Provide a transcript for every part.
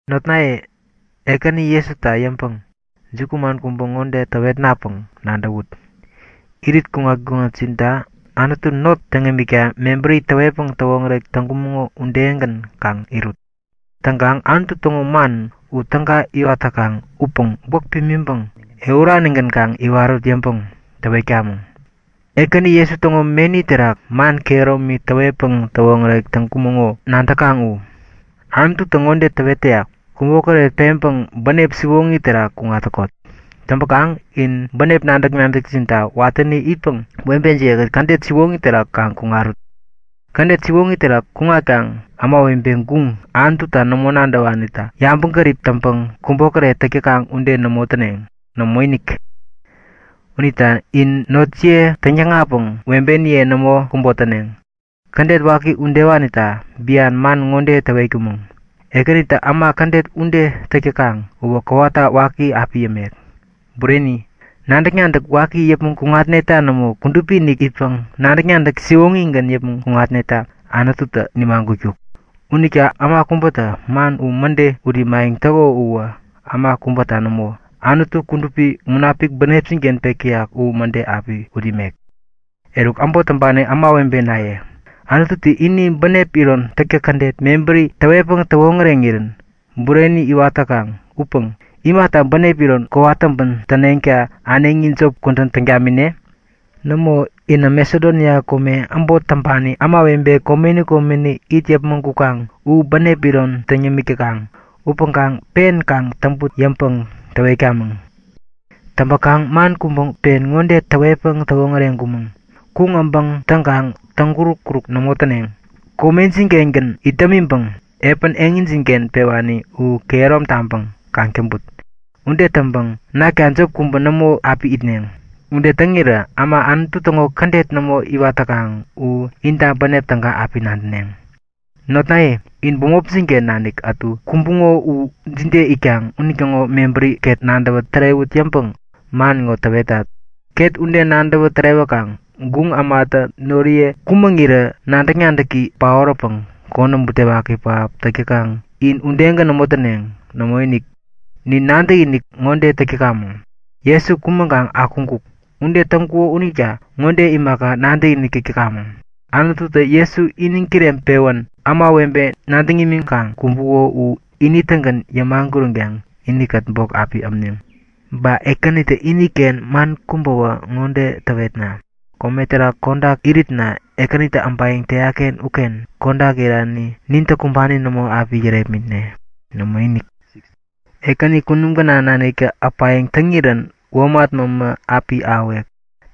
Notnaye, Ekäni Jesuta yäŋpäŋ jukuman kubä ŋode täwetnapäŋ nadäwut; Irit kuŋat-kuŋatjintä Anutu not täŋ imikta mebäri täwetpäŋ täwoŋärek täŋkumäŋo udegän kaŋ irut. Täŋkaŋ Anutu täŋo man u täga iwat täkaŋ upäŋ gwäk pimiŋpäŋ ehuranigän kaŋ iwarut yäŋpäŋ täwetkamäŋ. Ekäni Jesu täŋo meni terak man kehäromi täwetpäŋ täwoŋärek täŋkumäŋo nadäkaŋ u. Anututä ŋode täwet täyak; Kubokäret peŋpäŋ bänep siwoŋi terak kuŋat täkot. Täŋpäkaŋ in bänep nadäk-nadäkjinta watäni itpäŋ webejiye-kät kädet siwoŋi terak kaŋ kuŋarut. Kädet siwoŋi terak kuŋatkaŋ ämawebe guŋ, Anututa nämo nadäwanitä yabäŋgärip täŋpäŋ kubokäret täk täkaŋ ude nämo täneŋ. Nämoinik! Unita in notjiye täŋyäkŋatpäŋ webeniye nämo kubotäneŋ. Kädet waki udewanita bian man ŋode täwetkumäŋ; Ekänitä äma kädet ude täk täkaŋ uwä kowata waki api yämek. Bureni! Nadäk-nadäk waki yäpmäŋ kuŋatneta nämo, kudupi-inik itpäŋ nadäk-nadäk siwoŋigän yäpmäŋ kuŋatneta Anututä nimagutkuk. Unita äma kubätä man u mäde ut imayäŋ täko uwä äma kubäta nämo, Anutu, Kudupi Munapik bänepjin-ken pek täyak u mäde api ut imek. Eruk äbot täŋpani ämawebenaye, Anututä ini bänep iron täktäk kädet mebäri täwetpäŋ täwoŋäreŋirän bureni iwat täkaŋ upäŋ imata bänep iron kowat täŋpän täneŋta äneŋi jop kudän täŋ tamine? Nämo, inä Masedonia kome äbot täŋpani ämawebe komeni komeni it yäpmäŋ kukaŋ u bänep iron täŋ yämik täkaŋ. Upäŋkaŋ pen kaŋ täŋput yäŋpäŋ täwetkamäŋ. Täŋpäkaŋ man kubä pen ŋode täwetpäŋ täwoŋäreŋkumäŋ; Kuŋ äbäŋ täŋkaŋ täŋuruk-uruk nämo täneŋ. Komejin-kengän it dämiŋpäŋ epän ketjin-ken pewani u kehärom taŋpäŋ kaŋ täŋput. Ude täŋpäŋ nakta jop kubä nämo api itneŋ. Ude täŋirä äma Anutu täŋo kädet nämo iwat täkaŋ u inta bänep täga api nadäneŋ. Notnaye, in bämopjin-ken nanik ätu kumbuŋo u jide itkaŋ unitäŋo mebäri ket nadäwä tärewut yäŋpäŋ man ŋo täwetat. Ket ude nadäwä tärewäkaŋ guŋ ämatä noriye kumäŋirä nadäk-nadäki paoräpäŋ konäm butewaki pähap täk täkaŋ in udegän nämo täneŋ. Nämoinik! Nin nadäkinik ŋode täk täkamäŋ; Jesu kumäŋkaŋ akuŋkuk. Ude täŋkuko unita ŋode imaka nadäkinik täk täkamäŋ; Anututä Jesu iniŋ kireŋpewän ämawebe nadäŋ imiŋkaŋ kumbuŋo u ini-tägän yämaguränkaŋ inikät bok api ämneŋ. Ba Ekänitä iniken man kubäwä ŋode täwetna; Kome terak kodak iritna Ekänitä äbayäŋ täyak-ken uken kodak irani nintä kumbani nämo api yärepmitne. Nämoinik! Ekäni kunum gänaŋ naniktä äpayäŋ täŋirän womat mämä api ahäwek.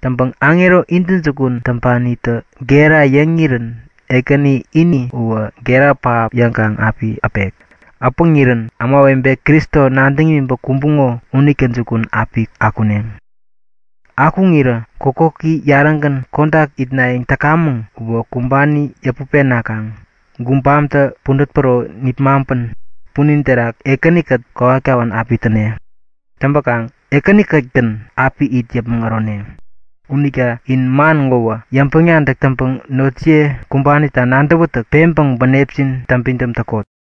Täŋpäŋ aŋero intäjukun täŋpanitä gera yäŋirän Ekäni ini uwä gera pähap yäŋkaŋ api äpek. Äpäŋirän ämawebe Kristo nadäŋ imiŋpäŋ kumbuŋo unitä jukun api akuneŋ. Akuŋirä kokoki yarägän kodak itnayäŋ täkamäŋ uwä kumbani yäput penakaŋ gubamtä pudät päro nipmaŋpän punin terak Ekäni-kät kowat kawän api täne. Täŋpäkaŋ Ekäni-kät-gän api it yäpmäŋ ärone. Unita in man ŋowä yäŋpäŋ-nadäk täŋpäŋ notjiye kumbanita nadäwätäk peŋpäŋ bänepjin täŋpidäm täkot.